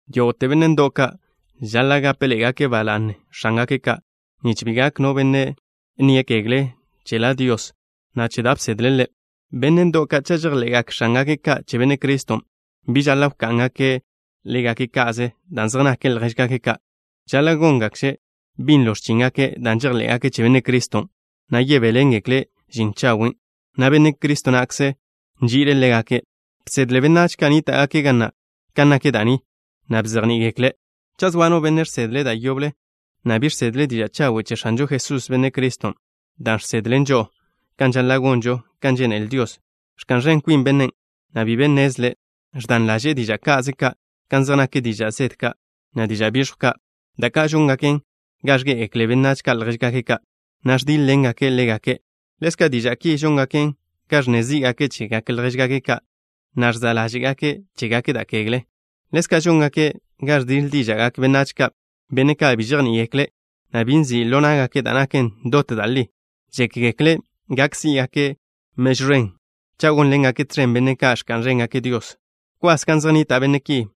Yógo'te benne' ndo'w ka' žaḻa' gápeḻe'egake' ba la'ne benne' x̱ángake' ka' nich bi gak no benne' nne x̱iwe'e che La Dios, na' che da' bsedle' Ḻe'. Benne' ndo'w ka' cha' žejḻe'gak x̱ángake' ka' che Benne' Criston', bi žaḻa' wká'ngake' ḻégake' ka'ze dan' zej nake' ljéžgake' ka'. Žaḻa' góngakže' binlo x̱chíngake' dan' žejḻé'gake' che Benne' Criston', na' yebéḻengekle' žin chawen', na' Benne' Cristo na'kzen' nži'ile' ḻégake'. Bsedle benách ka' nníta'gake' ga na' kan nak da' ni, na' bzejní'i-gekle'. Cha' zoa no benne' žsedle' da' yoble, na' bi žsedle' diža' chawen' che X̱anžo Jesús, Benne' Criston', dan' žsedlen žo'o kan žaḻa' gonžo kan žénele Dios, ẕka'n ẕen kwin bennen', na' bi be nnezle'. Ẕdan ḻaže'e diža' ka'ze ka' kan zej nak diža' zede ka', na' diža' biẕjw ka', da' ka' žóngaken ga ẕgé'egekle benách ka' ljéžgake' ka', na' ẕdíḻ-ḻengake' ḻégake'. Ḻezka' diža' ki žóngaken ga ẕnne zí'gake' chegak ljéžgake' ka', na' ẕza' ḻáže'gake' chégake' da' kegle. Ḻezka' žóngaken ga ẕdiḻ díža'gak benách ka', benne' ka' bi žejní'igekle', na' bi nzi' ḻo ná'gake' da' naken dot da' li. Žékgekle' gak sí'gake' mežw ẕen cha' gónḻengake' tẕen benne' ka' ẕka'n ẕéngake' Dios. Bkwas gan zej nnita' benne' ki.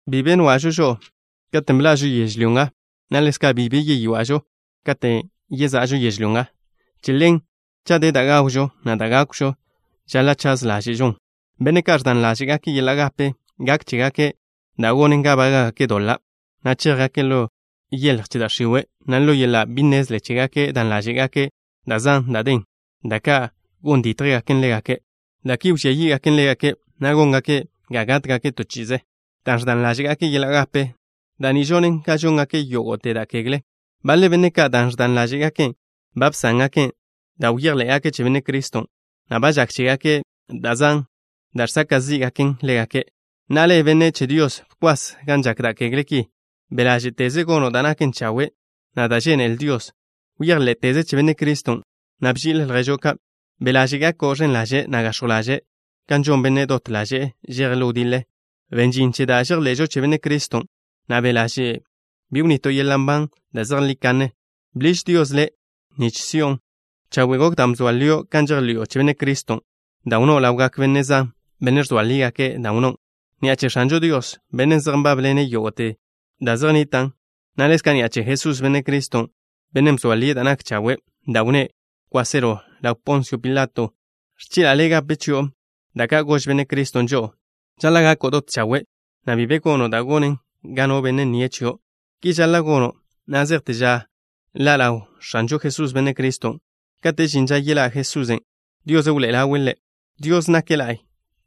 Bi be bia'žo žo'o katen' bḻa'žo yežlyó nga, na' ḻezka', bi be yeywa'žo katen' yeza'žo yežlyó nga. Che ḻen, cha' de da' gawžon, na' da' gákwžon, žaḻa' chaz ḻáže'žon. Benne' ka' ẕdan ḻáže'gake' yeḻa' gape, gak chégake' da' gonen ga bága'gake' doḻa', na' chéjgake' ḻo yeḻj che da' x̱iwe', na' ḻo yeḻa' bi nnezle chégake' dan ḻáže'gake' da' zan da' den, da' ka' gon dítjgaken ḻégake'. Da' ki wžía yí'gaken ḻégake', na' góngaken ga gátgake' to chi'ize. Dan' ẕdan ḻáže'gake' yeḻa' gape, da' ni žonen ga žóngake' yógo'te da' kegle. Baḻe benne' ka', dan' ẕdan ḻáže'gaken', ba bsángake' da' bejḻé'gake' che Benne' Criston', na' ba žak chégake' da' zan da' žsaka' zí'gaken ḻégake'. Na'a le', benne' che Dios, bkwas gan žak da' kegle ki. Be' ḻáže'teze gono' da' naken chawe', na' da' žénele Dios. Bejḻé'teze che Benne' Criston', na' bži'il lježo' ka'. Be' ḻaže' gako' ẕen ḻaže', na' gax̱jw ḻaže'. Kan žon bennen' dot ḻaže'e žeje' ḻo wdiḻe, ben žin che da' žejḻe'žo che Benne' Criston', na' be' ḻaže' bi wnito' yeḻa' nban da' zejlí kanne. Bḻiž Dios le' nich si'on. Chawe' gok da' bzoa lio' kan žejḻi'o che Benne' Criston', dan' wnnón' ḻawgak benne' zan, benne' ẕzoa lígake' dan' wnnón'. Ni'a che X̱anžo Dios, Bennen' zej nbanḻen yógo'te da' zej nnitan', na' ḻezka' ni'a che Jesús, Benne' Criston', Bennen' bzoa lie' da' nak chawe', da' wnné' kwáselo ḻaw Ponsio Pilato, ẕchi'la' le' gape chi'o da' ka' gož Benne' Criston' žo'o. Žaḻa' gako' dot chawe', na' bi be gono' da' gonen ga no benne' nnie' chio'. Ki žaḻa' gono' na' zejte ža ḻa' ḻaw X̱anžo Jesús, Benne' Criston'. Kate' žin ža yeḻá' Jesusen', Dios wḻoe'ele' ḻaw Ḻe'. Dios nake' la'y.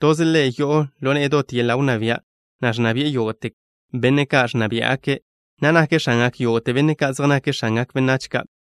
Toze' Ḻe' yo'o ḻo ne'e dot yeḻa' wnná bia', na' ẕnna bi'e yógo'te benne' ka' ẕnna biá'gake', na' nake' X̱angak yógo'te benne' ka' zej nake' x̱angak benách ka'.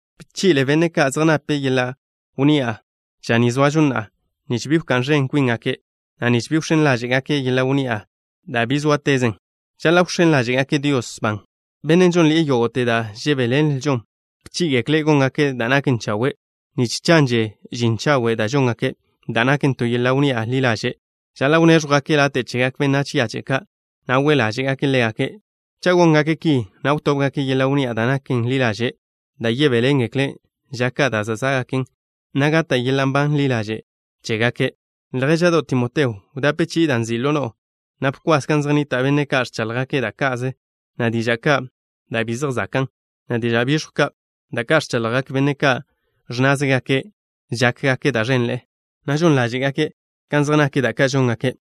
Bchi'le benne' ka' zej nape' yeḻa' wnni'a ža ni zoažo na'a, nich bi wká'n ẕen kwíngake', na' nich bi wx̱én ḻáže'gake' yeḻa' wnni'a na' dan' bi sóatezen. Žaḻa' wx̱én ḻáže'gake' Dios ban, Bennen' žónnḻi'e yógo'te da' žebéḻenlžon. Bchí'i-gekle' góngake' da' naken chawe', nich chanže žin chawe' da' žóngake', da' naken to yeḻa' wnni'a ḻi ḻaže'. Žaḻa' wnéẕjwgake' late' chegak benách yache' ka', na' we' ḻáže'gake' ḻégake'. Cha' góngake' ki, na' wtóbgake' yeḻa' wnni'a da' naken ḻi ḻaže', da' yebéḻengekle' ža ka' da' zá'gaken, na' gata' yeḻa' nban ḻi ḻaže' chégake'. Ljéža'do' Timoteo, wdape chi'i da' nzi' ḻo no'o, na' bkwas gan zej nnita' benne' ka' ẕchaḻjgake' da' ka'ze, na' diža' ka' da' bi zej zakan', na' diža' biẕjw ka', da' ka' ẕchaḻjgak benne' ka' ẕnnázegake' žákgake' da' ẕenḻe'e, na' žon ḻáže'gake' kan zej nak da' ka' žóngake'.